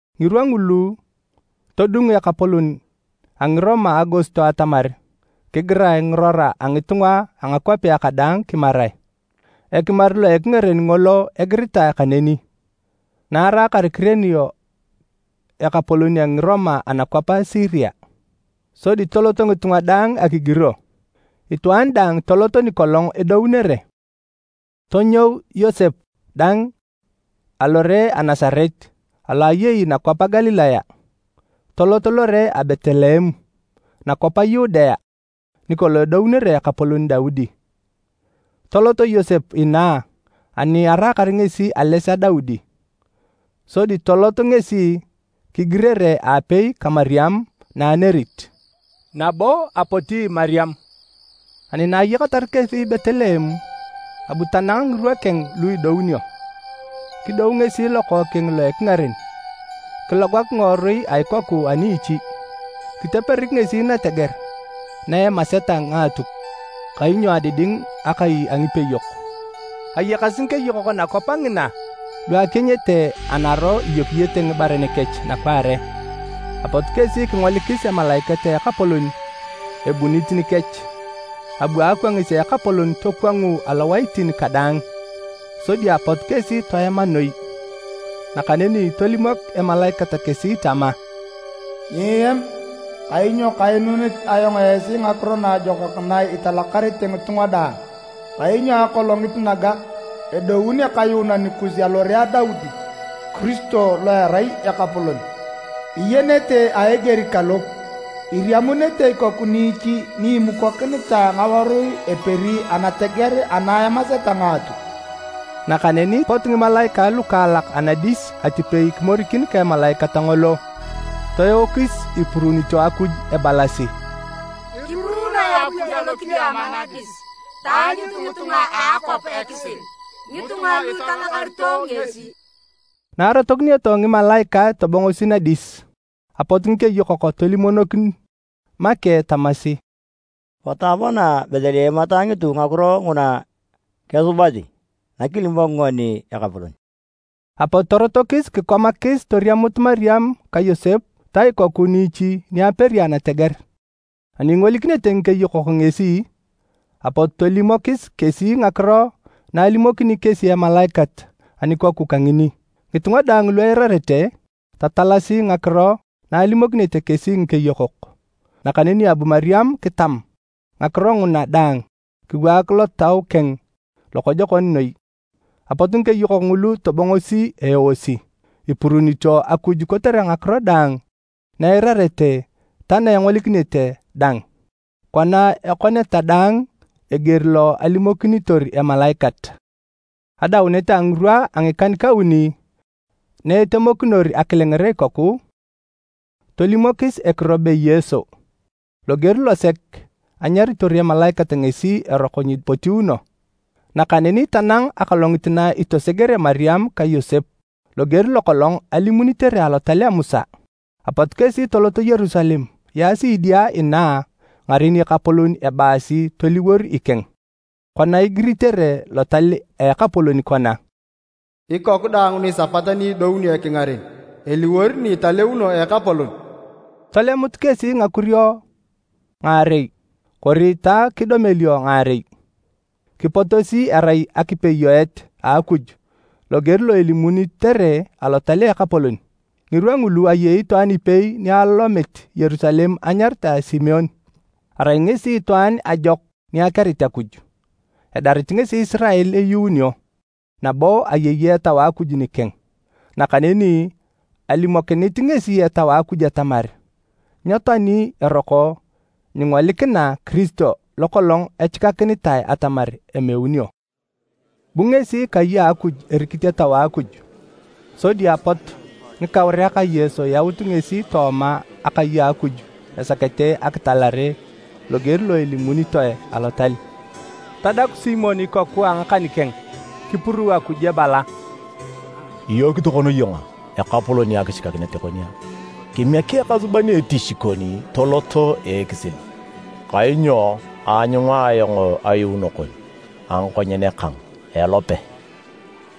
Ngirwa ngulu todung ekapolon a Ngiroma Augosto atamar kigirae ngirora a ngitunga a ngakwapea kadaang kimarae. Ekimar lo ekingaren ngolo egiritae kaneni, na araakar Kirenio ekapolon a Ngiroma anakwap a Siria. Sodi toloto ngitunga daang akigiro, itwaan daang tolot nikolong edounere! Tonyou Yosep dang alore a Nasaret alo eyei nakwap a Galilaya, tolot lore a Betleem, nakwap a Yudea, nikolong edounere ekapolon Daudi. Tolot Yosep inaa ani araakar ngesi ales a Daudi. Sodi tolot ngesi kigirere aapei ka Mariam na anerit. Nabo apoti Mariam. Ani na ayakatar kesi Betleem, abu tanang ngirwa keng lu idounio. Kidou ngesi lokookeng lo a ekingaren, kilogak ngiworui a ikoku a niichi, kiteperik ngesi nateger na emaseta ngaatuk, kainyo adiding akai a ngipeyok. Ayakasi ngikeyokok nakwap ngina lu akienyete anaro iyokiyete ngibaren kech nakwaare. Apot kesi kingolikis emalaikat a Ekapolon ebunit nikech, abu akwangis a Ekapolon tokwangu alowaitin kadaang, sodi apot kesi toema noi. Nakaneni tolimok emalaikat kesi tama, “Nyieam! Kainyo kainunit ayong esi ngakiro naajokak na italakarete ngitunga daang. Kainyo akolongit naga, edoun Ekayuunan kus alore a Daudi, Kiristo lo erai Ekapolon! Iyenete a eger kalo: iriamunete ikoku niichi ni imukokinitae ngawarui eperi anateger ana emaseta ngaatuk!” Nakaneni pot ngimalaikae lukaalak anadis atipei kimorikin ka emalaikat ngolo, toeokis ipuruunito Akuj ebalasi: “Kipuruunoe Akuj alokidiama nadis! Taanyut ngitunga a akwap ekisil, ngitunga lu italakarito ngesi!” Na arotokinioto ngimalaikae tobongosi nadis, apot ngikeyokok tolimonokin make tamasi, “Potu apana Betleem ataanyutu ngakiro nguna kesubasi, nakilimok ngoni Ekapolon.” Apot torotokis kikomakis toriamut Mariam ka Yosep ta ikoku niichi ni aperi anateger. Ani ingolikinete ngikeyokok ngesi, apot tolimokis kesi ngakiro na alimokinit kesi emalaikat anikoku kangini. Ngitunga daang lu eirarete, tatalasi ngakiro na alimokinete kesi ngikeyokok. Nakaneni abu Mariam kitam ngakiro nguna daang kiwaak lotau keng lokojokon noi. Apot ngikeyokok ngulu tobongosi eeosi, ipuruunito Akuj kotere ngakiro daang na eirarete ta na engolikinete dang, kona ekoneta daang eger lo alimokinitor emalaikat. Adaunet a ngirwa a ngikan-kauni na etemokinor akilenger ikoku, tolimokis ekiro be Yesu, loger losek anyaritor emalaikat ngesi eroko nyepotiuno. Nakaneni tanang akolongit na itosegere Mariam ka Yosep, loger lokolong alimunitere Alotal a Musa. Apot kesi toloto Yerusalem yaasi idia inaa ngaren Ekapolon ebaasi toliwor ikeng, kona igiritere Lotal a Ekapolon kona: “Ikoku daang nisapat ni idounio ekingaren, eliwor ni italeuno a Ekapolon.” Tolemut kesi ngakurio ngaarei kori ta kidomelio ngaarei, kipotosi erai akipeyoet a Akuj loger lo elimunitere Alotal a Ekapolon. Ngirwa ngulu ayei itwaan ipei ni alomit Yerusalem enyaritae Simeon. Arai ngesi itwaan ajokon ni akerit Akuj, edarit ngesi Isirael eyuunio, nabo ayei Etau a Akuj nikeng. Nakaneni alimokinit ngesi Etau a Akuj atamar nyetoani eroko nyingolikina Kiristo lokolong echikakinitae atamar emeunio. Bu ngesi kai a Akuj erikit Etau a Akuj, sodi apot ngikauriak a Yesu yaut ngesi tooma akai a Akuj esakete akitalere loger lo elimunitoe Alotal. Tadaku Simeon ikoku a ngakan keng kipuruu Akuj ebala: “Iyook tokona iyong Ekapolon akichikakinet kon, kimiek ekasuban etich kon tolot a ekisil. Kainyo aanyunga ayong ayuuno kon a ngakonyen kang a elope,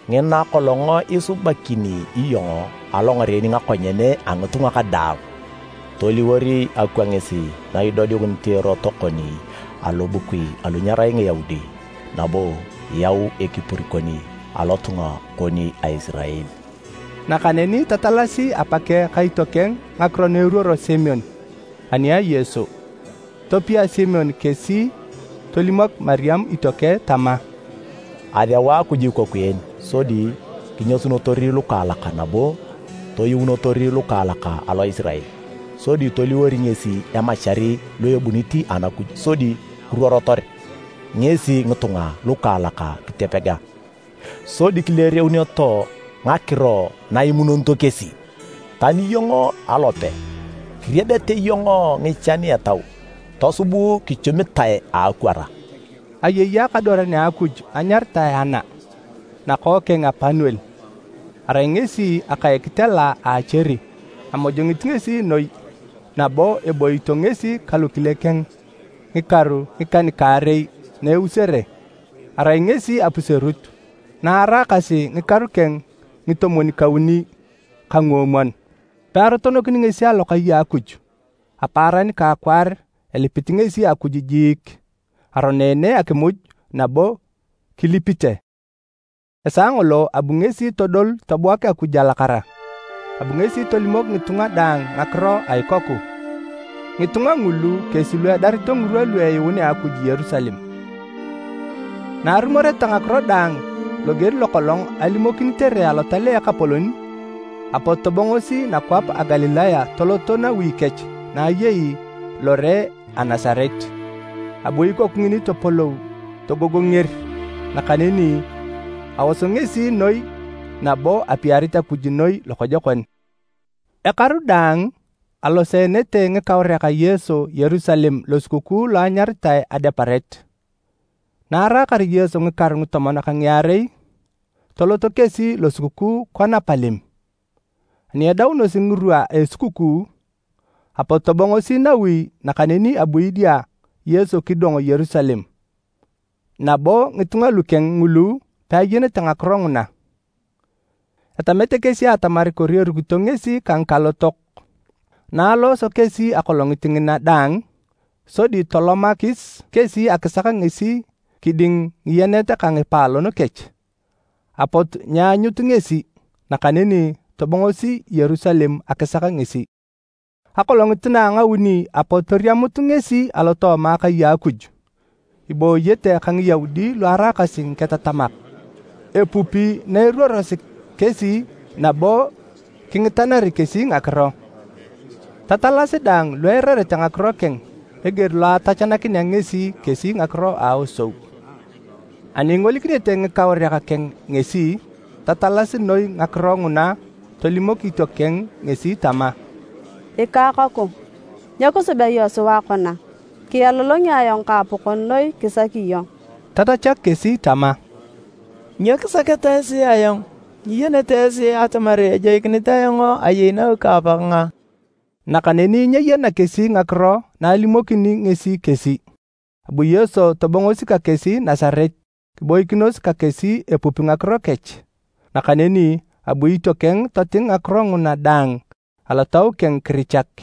ngina kolong isubakini iyong alongaren ngakonyen a ngitunga kadaang. Toliwor akwangis na idodiunit erot kon alobukui alu nyerai Ngiyaudi, nabo yau ekipur kon lotunga kon a Isirael.” Nakaneni tatalasi apakeng ka itiokeng ngakiro na eruoro Simeon ani a Yesu. Topia Simeon kesi tolimok Mariam itiokeng tama, “Aseu Akuj ikoku en sodi kinyasunotor lukaalak nabo toyuunotor lukaalak alo Isirael. Sodi toliwor ngesi emachar lo ebunit Anakuj sodi kiruorotor ngesi ngitunga lukaalak kitopega, sodi kileereuneto ngakiro na imunonito kesi. Tani iyong alope, kiriebete iyong ngichan etau tosub kichumitae a akwara.” Ayei akadwaran a Akuj anyaritae Ana, nakookeng a Panuel, arai ngesi aka a ekitela a Acheri. Amojongit ngesi noi, nabo eboito ngesi ka lokile keng ngikaru ngikan-kaarei na eusere. Arai ngesi apuserut na araakasi ngikaru keng ngitomwon-kauni ka nguomwon. Pearotonokini ngesi alokai a Akuj, apaaran ka akwaar elipit ngesi Akuj jiik, aroneene akimuj, nabo kilipite. Esaa ngolo abu ngesi todol tobuak Akuj alakara. Abu ngesi tolimok ngitunga daang ngakiro a ikoku. Ngitunga ngulu kesi lu edarito ngirwa lu eyuunea Akuj Yerusalem. Na arumoreta ngakiro daang loger lokolong alimokinitere alotal a Ekapolon, apot tobongosi nakwap a Galilaya toloto nawi kech na ayei lore a Nasaret. Abu ikoku ngini topolou togogonger, nakaneni aos ngesi noi nabo apiarit Akuj noi lokojokon. Ekaru daang aloseenete ngikauriak a Yesu Yerusalem Losukukuu lo anyaritae Adeparet. Na araakar Yesu ngikaru ngitomon ka ngiarei, toloto kesi losukukuu kona palem. Ani edaunosi ngirwa a esukukuu, apot tobongosi nawi nakaneni abu idia Yesu kidong Yerusalem. Nabo ngitunga lukeng ngulu peayenete ngakiro nguna, etamete kesi atamar kori erukito ngesi ka ngikalotok, na alooso kesi akolongit ngina daang, sodi tolomakis kesi akisak ngesi kiding ngiyenet ka ngipaalon kech. Apot nyeanyut ngesi, nakaneni tobongosi Yerusalem akisak ngesi. Akolongit na a ngauni apot toriamut ngesi alotooma Akai a Akuj, ibooyete ka Ngiyaudi lu araakasi ngiketatamak, epupi na eruorosi kesi nabo kingitanari kesi ngakiro. Tatalasi daang lu eirarete ngakiro keng eger lo atachanakinea ngesi kesi ngakiro a aosou. Ani ingolikinete ngikauriak keng ngesi, tatalasi noi ngakiro nguna tolimok itiokeng ngesi tama, “Ikakoku, nyo kisubea iyong sua kona? Kialolongi ayong ka apakon noi kisaki iyong.” Tatachak kesi tama, “Nyo kisaketa esi ayong? Nyiyenete esi atamar ejoikinit ayong ayei nawi ka Apakang a?” Nakaneni nyeyena kesi ngakiro na alimokini ngesi kesi. Abu Yesu tobongosi ka kesi Nasaret kiboikinos ka kesi epupi ngakiro kech. Nakaneni abu itiokeng toting ngakiro nguna daang alotau keng kirichak.